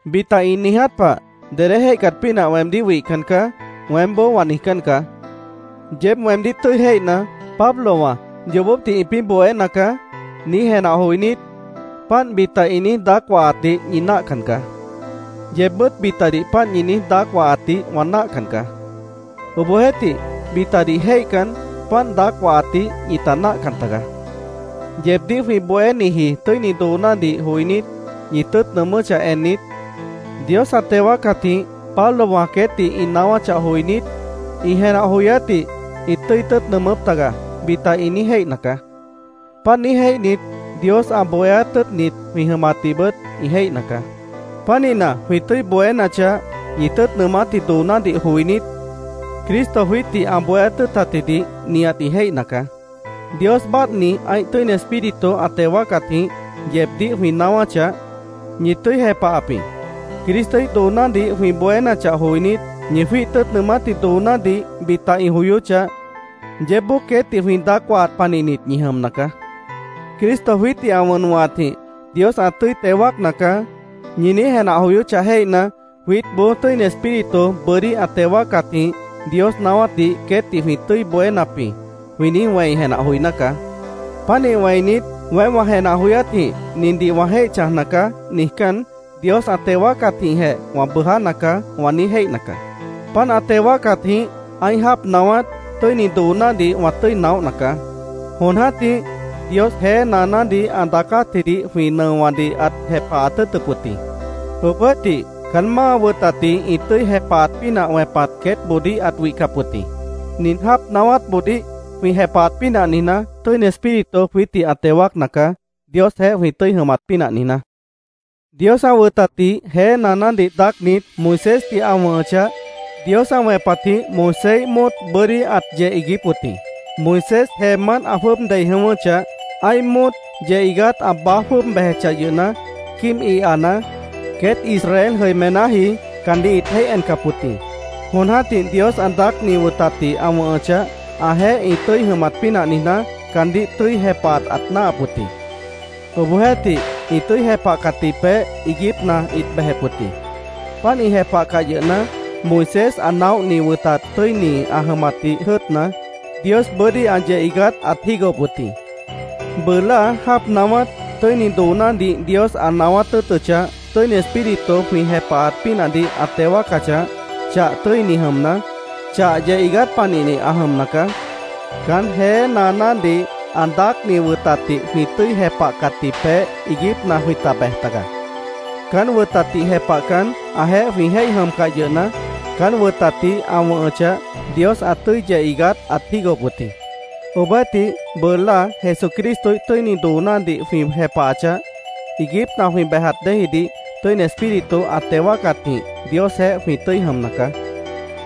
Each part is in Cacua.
Bita ĩ niiját pah, “Dedé jéihcat pínah weemdíh wihcan caá”, weémboó wã niijcán caá. Yeéb weemdíh tʉ́i jéihna, “Pablowã yoobópdih ĩpĩ́ bohéna caá”, niíj jenah joinít, páant bita ĩ niíj daác wahatdih ñi náahcan caá. Yeebbʉ́t bitadih páant ñi niíj daác wahatdih wã náahcan caá. Obohjeéhtih, bitadih jéihcan, páant daác wahatdih ñita náah taga. Yeebdíh jwĩ bohéniji tʉ́ini doonádih joinít, ñi tʉ́ʉt nʉʉmʉ́chah ennit, “Dios ã teo wáacatjĩh Pablowã queétdih ĩ naáwáchah joinít, ĩ jenah joyátdih ĩt tʉ́i tʉ́ʉt nʉʉmʉ́p taga”, bita ĩ niíj jéihna caá. Páant niíj jéihnit, Dios ã bohéát tʉ́ʉtnit jwĩ jʉmatdihbʉt ĩ jéihna caá. Pánihna, jwĩ tʉ́i bohénachah, ñi tʉ́ʉt nʉʉmátji doonádih joinít, Cristo jwiítdih ã bohéát tʉ́ʉtatjidih nihat ĩ jéihna caá. Dios báadhni ã́ih Tʉ́ini Espíritu ã teo wáacatjĩh, yeebdíh jwĩ naáwáchah, ñi tʉ́i jepahap jĩ. Cristoíh doonádih jwĩ bohénachah joinít, ñi jwíih tʉ́ʉt nʉʉmátji doonádih bita ĩ joyóchah, yeébboó queétdih jwĩ daác wahat panihnit ñi jʉmna caá. “Cristo jwiítdih ã wʉn wʉ̃hatjĩh Dios ã tʉ́i teo wáacna caá”, ñi niíj jenah joyóchah jéihna, jwiítboó “Tʉ́ini Espíritu bʉ́dí ã teo wáacatjĩh Dios naáwátdih queétdih jwĩ tʉ́i bohénap jĩ”, jwĩ niíj wẽi jenah joiná caá. Pánih wẽinit, “Weém wã jenah joyátjĩh nindih wã jéih chãjna caá”, niijcán, “Dios ã teo wáacatjĩhjeh wã bʉʉjána caá”, wã niíj jéihna caá. Páant ã teo wáacatjĩh ã́ih jáap naáwát, tʉ́ini doonádih wã tʉ́i naóhna caá. Jon jã́tih Dios jeé naanádih ã daacátjidih jwĩ nʉowãdih ãt jepahat tʉ́ʉtʉp wʉt jĩ. Obohjeéhtih, caán máa wʉtatdih ĩ tʉ́i jepahat pínah wẽpat queétboodíh ãt wihcap wʉt jĩ. Nin jáap naáwátboodíh jwĩ jepahat pínah niijná, Tʉ́ini Espíritu jwiítdih ã teo wáacna caá, Diosjeéh jwĩ tʉ́i jʉmat pínah niijná. Dios ã wʉtatdih jeé naanádih daácnit, Moisésdih ã wʉ̃hʉchah, Dios ã wẽpatjĩh Moiséíh móot bʉ́dí ãt yeh iiguíp wʉt jĩ. Moisés jeemánt ã jwʉ́ʉb dei jʉ̃ʉ́wʉ́chah, ã́ih móot yeh iigát ã baáj jwʉ́ʉb bejechah yʉhna, quíib ihana, queét Israel jʉimenáji caandíh ĩt jéih encap wʉt jĩ. Jon jã́tih Dios ã daácni wʉtatdih ã wʉ̃hʉchah, ãjeéh ĩ tʉ́i jʉmat pínah niijná, caandíh tʉ́i jepahat ãt náahap wʉt jĩ. Obohjeéhtih, ĩ tʉ́i jepahcatji peéh iiguípna ĩt bejep wʉt jĩ. Páant ĩ jepahcah yʉhna, Moisés ã naóhni wʉtat tʉ́ini ã jʉmatdih jʉ́ʉtna, Dios bʉ́dí ã yeh iigát ãt jígohop wʉt jĩ. Bʉʉ láa jáap naáwát, tʉ́ini doonádih Dios ã naáwát tʉ́ʉtʉchah, Tʉ́ini Espíritu jwĩ jepahat pínahdih ã teo wáacachah, chah tʉ́ini jʉmna, chah yeh iigát panihni ã jʉmna caá. Caán jeé naanádih ã daácni wʉtatdih jwĩ tʉ́i jepahcatji peéh iiguípna jwĩta bej taga. Caán wʉtatdih jepahcan, ãjeéh jwĩ jéih jʉmcah yʉhna, caán wʉtatdih ã wʉ̃hʉchah, Dios ã tʉ́i yeh iigát ãt jígohop wʉt jĩ. Obohjeéhtih, bʉʉ láa Jesucristoíh tʉ́ini doonádih jwĩ jepahachah, iiguípna jwĩ bejat déejidih, Tʉ́ini Espíritu ã teo wáacatjĩh Diosjeéh jwĩ tʉ́i jʉmna caá.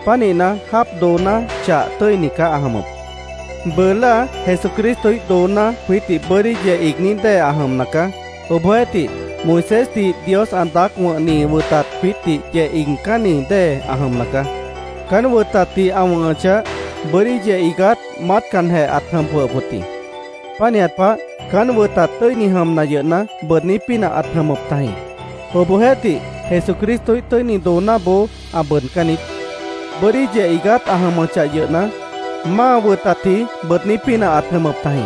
Pánihna, jáap dooná chah tʉ́ini caá ã jʉmʉp. Bʉʉ láa Jesucristoíh dooná jwiítdih bʉ́dí yeh iigní dée ã jʉmna caá. Obohjeéhtih, Moisésdih Dios ã daác wʉ̃hni wʉtat jwiítdih yeh iigcánni dée ã jʉmna caá. Caán wʉtatdih ã wʉ̃hʉchah, bʉ́dí yeh iigát maátcanjeh ãt jʉm jwʉhʉp wʉt jĩ. Pánihat pah, caán wʉtat tʉ́ini jʉmna yʉhna, bʉʉdní pínah ãt jʉmʉp tajĩ. Obohjeéhtih, Jesucristoíh tʉ́ini doonáboó ã bʉʉdcán niít. Bʉ́dí yeh iigát ã jʉmʉchah yʉhna, máa wʉtatji bʉʉdní pínah ãt jʉmʉp tajĩ.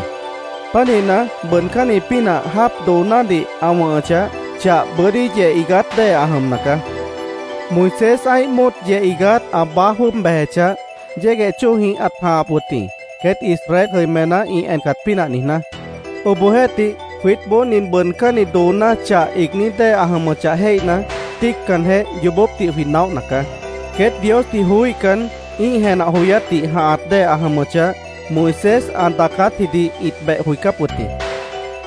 Pánihna, bʉʉdcánni pínah jáap doonádih ã wʉ̃hʉchah, chah bʉ́dí yeh iigát dée ã jʉmna caá. Moisés ã́ih móot yeh iigát ã baáj jwʉ́ʉb bejechah, yégueh chóojĩh ãt jãhap wʉt jĩ, queét Israel jʉimená ĩ encat pínah niijná. Obohjeéhtih, jwiítboó nin bʉʉdcánni dooná chah iigní dée ã jʉmʉchah jéihna, tíiccanjeh, yoobópdih jwĩ naóhna caá. Queét Diosdih joííhcan, ĩ́ih jenah joyátdih jãhat dée ã jʉmʉchah, Moisés ã daacátjidih ĩt beh joicáp wʉt jĩ.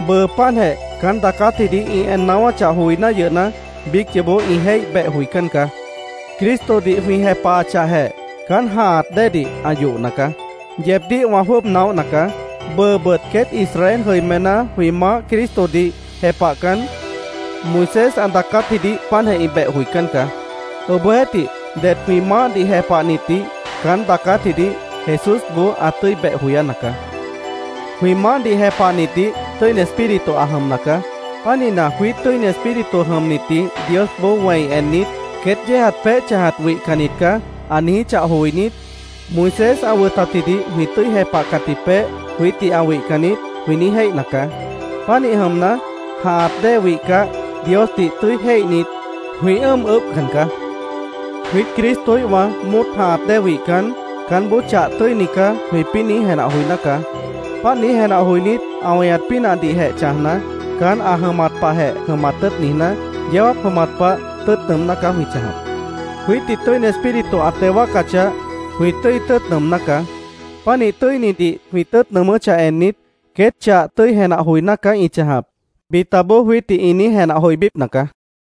Bʉʉ páantjeh caán daacátjidih ĩ en naáwáchah joiná yʉhna, biíc yoobó ĩ jéih beh joicán caá. Cristodih jwĩ jepahachahjeh, caán jãhat déedih ã yohna caá. Yeebdíh wã jwʉ́ʉb naóhna caá. Bʉʉbʉt queét Israel jʉimená jwĩ Maáh Cristodih jepahcan, Moisés ã daacátjidih páantjeh ĩ beh joicán caá. Obohjeéhtih, det jwĩ Maáhdih jepahnitdih caán daacátjidih Jesúsboó ã tʉ́i beh joyána caá. Jwĩ Maáhdih jepahnitdih Tʉ́ini Espíritu ã jʉmna caá. Pánihna, jwiít Tʉ́ini Espíritu jʉmnitdih Diosboó wẽi ennit, “Queét yéejat peéh chãjat wihcannit caá”, ã niijíchah joinít, “Moisés ã wʉtatjidih jwĩ tʉ́i jepahcatji peéh jwiítdih ã wihcan niít”, jwĩ niíj jéihna caá. Pánih jʉmna, jãhat dée wihcah, Diosdih tʉ́i jéihnit, jwĩ ʉ́ʉm ʉʉ́bhcan caá. Jwiít Cristoíhwã móot jãhat dée wihcan, “Caánboó chah tʉ́ini caá”, jwĩpĩ́ niíj jenah joiná caá. Páant niíj jenah joinít, ã weñat pínahdihjeh chãjna, caán ã jʉmat pahjeh jʉmat tʉ́ʉt niijná, yeó jáap jʉmat pah tʉ́i tʉ́ʉt nʉʉmná caá jwĩ chãjap. Jwiítdih Tʉ́ini Espíritu ã teo wáacachah, jwĩ tʉ́i tʉ́ʉt nʉʉmná caá. Pánih tʉ́inidih jwĩ tʉ́ʉt nʉʉmʉ́chah ennit, “Queét chah tʉ́i jenah joiná caá ĩ chãjap”, bitaboó jwiítdih ĩ niíj jenah joibípna caá.